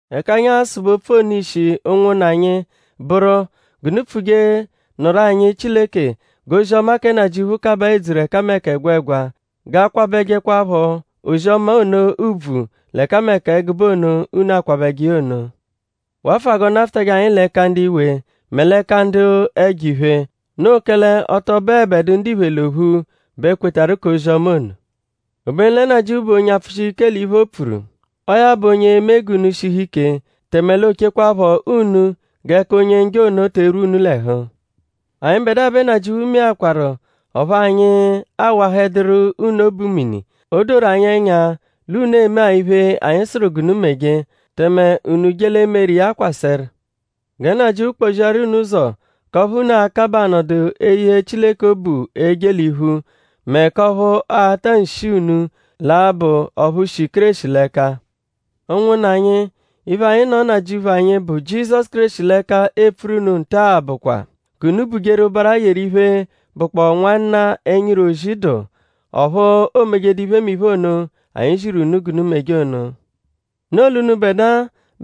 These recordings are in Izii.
Ẹka anyi a-sụbe opfu ono ishi ụnwunna anyi bụru; g'unu pfuje nụru anyi Chileke g'ozi-ọma kẹ Nnajịuphu kabaa edzuru ẹkameka ẹgwegwa; g'a kwabẹjekwapho ozi-ọma ono ùbvù l'ẹkameka ẹgube ono, unu akwabẹje iya ono. Wafụa g'ọ nafụtaje anyi l'ẹka ndu iwe mẹ l'ẹka ndu ẹjo-iphe. Noo kẹle ọ tọ bụebedu ndiphe l'ophu bẹ kwetarụ k'ozi-ọma ono. Obenu lẹ Nnajịuphu bụ onye apfụshije ike l'iphe, o pfuru. Ọo ya bụ onye e-me g'unu shihu ike; tẹme l'o chekwaphọ unu g'ẹka Onye-Njọ ono te erwu unu l'ẹhu. Anyịbedua bẹ Nnajịuphu meakwaru ọphu anyi awahẹduru unu obu mini. O doru anyi ẹnya l'unu eme-a iphe, anyi sụru g'unu meje; tẹme unu je l'e-meru iya kwasẹru. Gẹ Nnajịuphu kpọ-ziaru unu ụzo k'ọphu unu akabaa anọdu eye Chileke obu eje l'iphu; mẹ k'ọphu ata nshi unu l'a-bụ ọphu shi Kéreshi l'ẹka. Ụnwunna anyi; iphe, anyi nọ Nnajịuphu anyi, bụ Jizọsu Kéreshi l'ẹka epfuru unu nta-a bụkwa; g'unu bujeru ụbara yeru iphe, bụkpoo nwanna, ẹnyiru ozi dụ; ọphu o mejedu iphemiphe ono, anyi ziru unu g'unu meje ono. Noo l'unubẹdua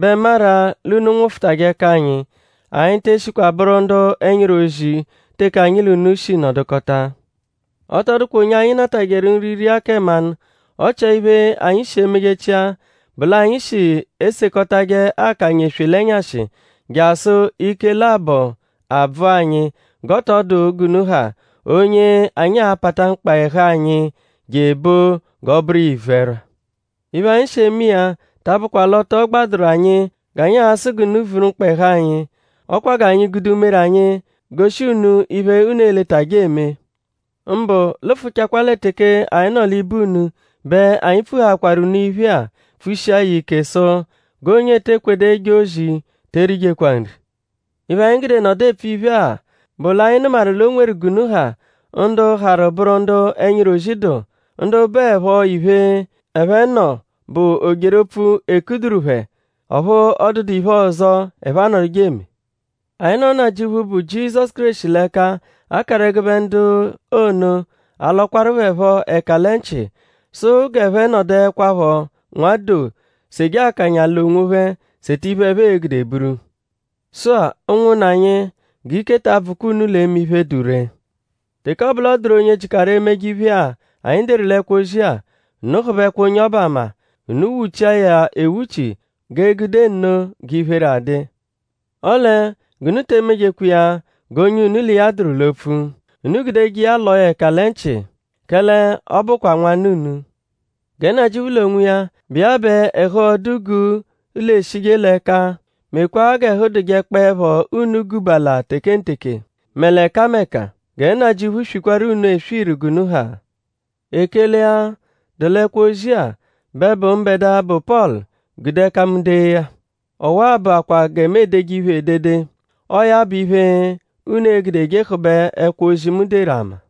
bẹ maru-a l'unu nwụfutaje ẹka anyi. Anyi te eshikwa bụru ndu ẹnyiru ozi teke anyi l'unu shi nọdukota. Ọ tọ dụkwa onye anyi natajẹru nri ria kẹ mmanụ. Ọ chia iphe, anyi shi emejechia bụ l'anyi shi esekọtaje akanya eswe l'ẹnyashi jasụ ike labọ abvụ anyi; g'ọ tọ dụ g'unu ha onye anyi a-pata mkpa ẹhu anyi je ebo g'ọ bụru iya ivu-ẹrwa. Iphe, anyi shi eme iya ta abụkwa l'ọ tọ gbadụru anyi g'anyi a-sụ g'unu vuru mkpa ẹhu anyi. Ọ kwa g'anyi gude umere anyi goshi unu iphe, unu e-letajẹ eme. Mbụ lụfuchakwa lẹ teke anyi nọ l'ibe unu bẹ anyi pfuhaakwaru unu iphe-a pfushia ya ike sụ: “G'onye ete kwedu eje ozi te erijekwa nri.” Iphe, anyi gude nọdu epfu iphe-a bụ l'anyi nụmawaru l'o nweru g'unu ha ndu harụ bụru ndu ẹnyiru ozi dụ; ndu bụepho iphe, ẹphe nọ bụ o-jeru-opfu, 'e kuduru phẹ; ọphu ọ dụdu iphe ọzo, ẹphe anọduje eme. Anyi nọ Nnajịuphu, bụ Jizọsu Kéreshi l'ẹka akaru ẹgube ndu ono alọkwaru phẹ phọ ẹka lẹ nchị sụ g'ẹphe nọduekwapho nwa doo seje akanya l'onwophẹ seta iphe, ẹphe e-gude buru. Sụ-a; ụnwunna anyi; g'ike ta abvụkwa unu l'eme iphe, dụ ree. Teke ọ bụ l'ọ dụru onye jịkaru emeje iphemiphe-a, anyi deru l'ẹkwo-ozi-a; unu hụbekwa onye ọbu ama. Unu wuchia ya ewuchi; g'e gude nno g'iphere a-dụ iya. Ọle g'unu te emejekwa iya g'onye unu l'iya dụru l'opfu. Unu gudeje iya lọo ya ẹka lẹ nchị; kẹle ọ bụkwa nwanna unu. Gẹ Nnajịuphu l'onwiya, bụ iya bẹ ẹhu-ọdu-guu l'eshije l'ẹka mekwaa g'ẹhu dụjekpoepho unu gubala tekenteke; mẹ l'ẹkameka. Gẹ Nnajịuphu swikwaru unu eswiru g'unu ha. Ekele-a, dụ l'ẹkwo-ozi-a bẹ bụ mbẹdua, bụ Pọlu gude ẹka mu dee ya. Ọwa-a bụakwaa gẹ mu edeje iphe edede. Ọo ya bụ iphe, unu e-gudeje hụbe ẹkwo-ozi, mu deru ama.